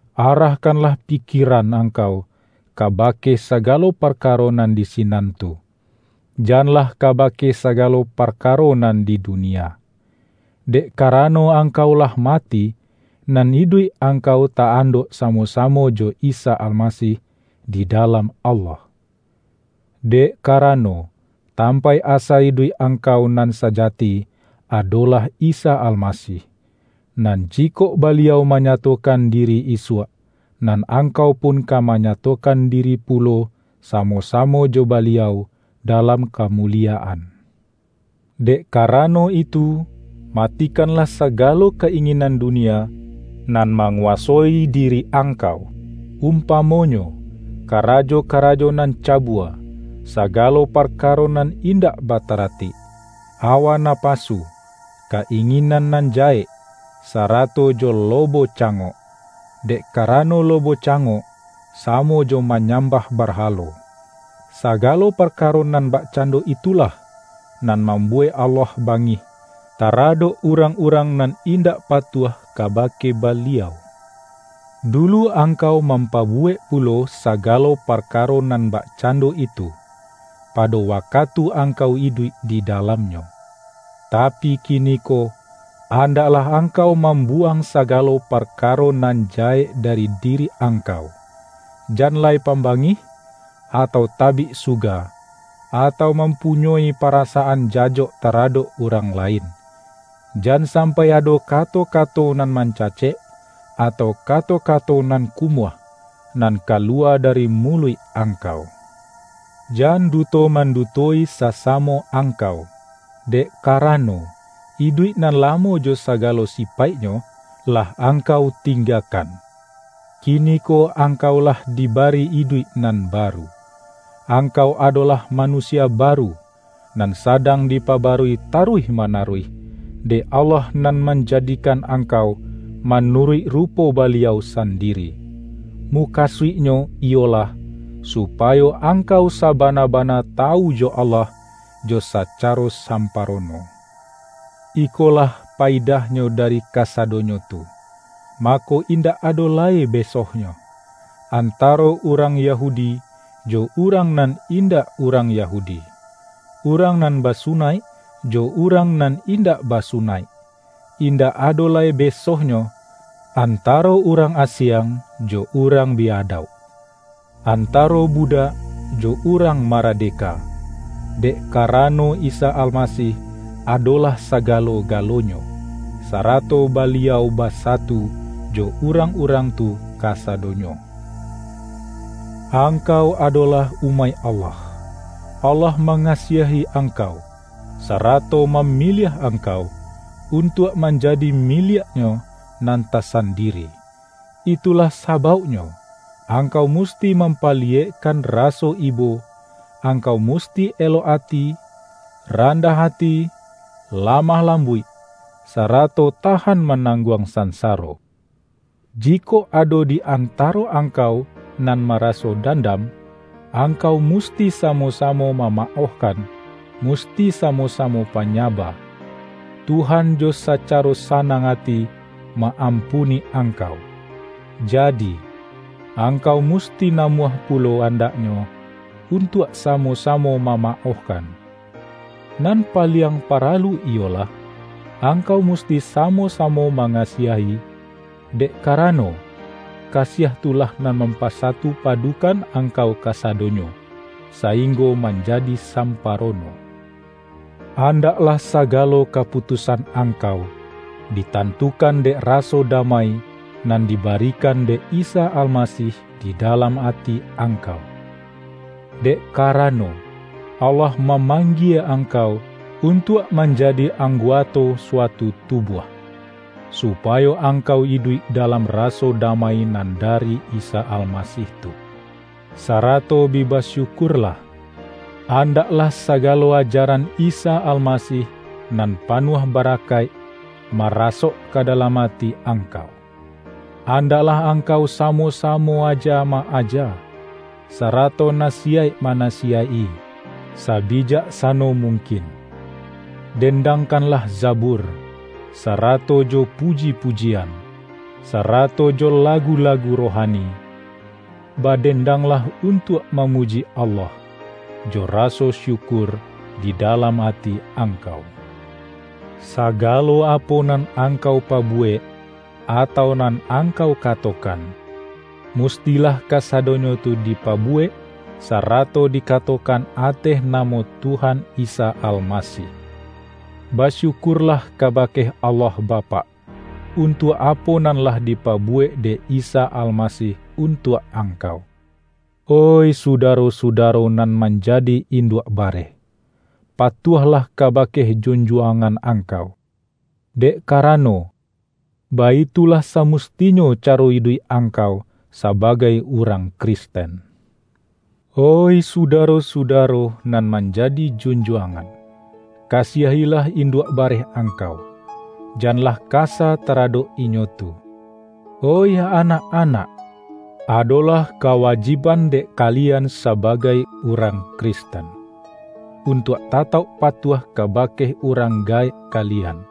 Arahkanlah pikieran angkau kaba-ke sagalo parkaro nan di sinan tu, janlah kabake sagalo parkaro nan di dunia. Dek karano angkau lah ma-ti, nan iduik angkau ta-andok samo-samo jo Isa Almasih di dalam Allah. Dek karano, tampaik asa iduik ang-kau nan sajati adolah Isa Almasih, nan jikok Baliau manyatokan di-ri isuak, nan angkau pun ka manya-tokan diri pulo samo-samo jo Baliau dalam kamuliyaan. Dek karano itu, matikanlah saga-lo ka-inginan dunia nan manguwa-soi diri angkau, umpamonyo, kara-jo-karajo nan cabua, sagalo parkaro nan indak bataratik, awa napasu, ka-inginan nan jahek, sarato jo lobo ca-ngok, (dek karano lobo cangok, sa-mo jo manyambah barhalo). Sagalo parkaro nan bakcando itulah, nan mambuwek Allah bangih, taradok urang-urang nan indak patuah kaba-ke Baliau. Dulu angkau mampabu-wek pulo sagalo parkaro nan bakcan-do itu, pado wakatu angkau iduik di dalamnyo. Tapi kiniko, andaklah angkau mam-buwang sagalo parkaro nan jahek da-ri diri angkau: jan lai pambangih, atau tabik suga, atau mampunyoi parasaan jajok taradok urang lain. Jan sampai ado kato-kato nan mancacek, atau ka-to-kato nan kumuah, nan kaluwa dari muluik angkau. Jan duto manduto-i sasamo angkau, dek karano, iduik nan lamo jo sagalo sipaiknyo, lah angkau tinggakan. Kiniko angkau lah dibari iduik nan baru. Angkau adolah manu-sia baru, nan sadang dipabarui taruih manaruih, dek Allah nan manjadikan angkau manuruik rupo Baliau sandi-ri. Mukasuiknyo iyolah, supayo ang-kau sabana-bana tawu jo Allah jo sa-caro samparono. Ikolah payidahnyo dari kasadonyo tu, mako indak ado lai besohnyo, antaro urang Yahudi, jo urang nan indak urang Yahudi, urang nan basunaik, jo urang nan indak ba-sunaik, indak ado lai besohnyo, anta-ro urang asiang, jo urang bi-adauk, antaro budak jo urang maradeka, dek karano Isa Almasih adolah sagalo-ga-lonyo, sarato Baliau basatu jo urang-urang tu kasadonyo! Angkau adolah umaik Allah. Allah mangasiahi angkau, sarato mamiliah angkau, untuak manjadi miliak-Nyo nan tasandiri. Itulah sabauknyo, ang-kau musti mampaliyekkan raso ibo, angkau musti elok ati, randah ati, la-mah lambuik, sarato tahan manang-guang sansaro. Jikok ado di antaro angkau nan maraso dandam, angkau musti samo-samo mamaohkan, musti samo-samo panyaba. Tuhan jo saca-ro sanang ati ma-ampuni angkau, ja-di, angkau musti namuah pulo andak-nyo, untuak samo-samo mamaohkan. Nan paliang paralu iyolah: Angkau musti samo-samo mangasiahi, dek ka-rano, kasiah tu lah nan mampasatu-padukan angkau kasadonyo, sainggo manjadi samparono. Andaklah sa-galo kaputusan angkau, ditantukan dek raso damai nan dibarikan dek Isa Almasih di dalam ati angkau. Dek ka-rano, Allah mamanggie angkau un-tuak manjadi angguato suatu tubuah, supayo angkau iduik dalam raso da-mai nan dari Isa Almasih tu. Sarato bi basyukurlah. Andaklah sagalo aja-ran Isa Almasih nan panuah barakaik, marasok ka dalam ati angkau. Andak-lah angkau samo-samo aja ma-aja, sa-rato nasiyaik manasiyaik-i sabijaksa-no mungkin. Dendangkanlah Zabur, sarato jo puji-pujian, sarato jo lagu-la-gu rohani; badendanglah untuak ma-muji Allah, jo raso syukur di dalam ati angkau. Sagalo apo nan angkau pabuwek, atau nan angkau katokan, mustilah kasadonyo tu dipabuwek, sa-rato dikatokan ateh namo Tuhan Isa Almasih. Basyukurlah kabake Allah Bapak, untuak apo nan lah dipabuwek dek Isa Almasih untuak angkau. Oih sudaro-sudaro nan manjadi induak bareh! Patuahlah kabake jun-juangan angkau, dek karano, baitu-lah samustinyo caro iduik angkau sa-bagai urang Kristen. Oih sudaro-sudaro nan manjadi junjuangan! Kasiahilah induak bareh angkau. Janlah kasa taradok inyo tu. Oih anak-anak! Adolah kawajib-an dek kalian sabagai urang Kristen, untuak tatauk patuah kabake urang gaek kalian,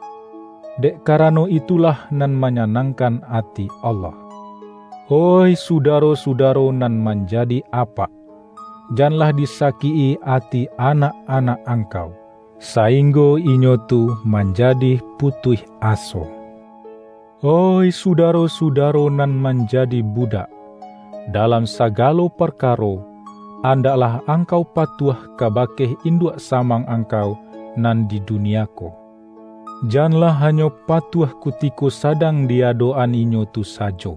dek karano itulah nan manyanangkan ati Allah. Oih sudaro-sudaro nan manjadi apak! Janlah disakik-i ati anak-anak angkau, sainggo inyo tu manjadi pu-tuih aso. Oih sudaro-sudaro nan manjadi budak! Dalam sagalo parkaro, andak-lah angkau patuah kabake induak sa-mang angkau nan di dunia ko. Jan-lah hanyo patuah kutiko sadang di adok-an inyo tu sajo,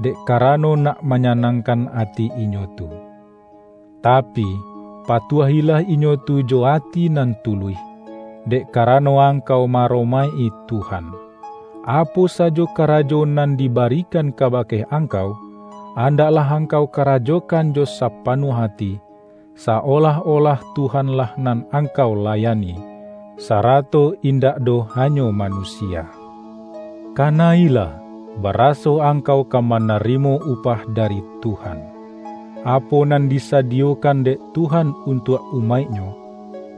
dek karano nak manyanangkan ati inyo tu. Tapi, pa-tuahilah inyo tu jo ati nan tuluih, dek karano angkau ma-aromaik-i Tuhan. Apo sajo karajo nan dibarikan ka-bake angkau, andaklah angkau kara-jokan jo sapanuah ati, sa-olah-olah Tuhan-lah nan angkau layani, sara-to indak doh hanyo manusia. Ka-na-ilah, baraso angkau ka manarimo upah dari Tuhan. Apo nan disadiyo-kan dek Tuhan untuak umaik-Nyo,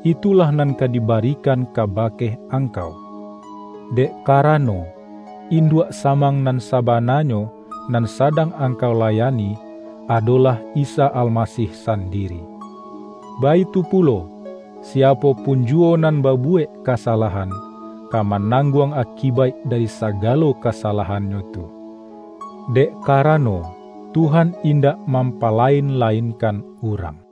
itulah nan ka dibarikan kabake ang-kau. Dek karano, induak samang nan sabananyo nan sadang angkau layani, adolah Isa Almasih sandiri. Baitu pulo, siapo pun juwo nan babuwek kasalahan, ka manangguang akibaik dari sagalo kasalahannyo tu; dek ka-rano, Tuhan indak mampalain-lain-kan urang.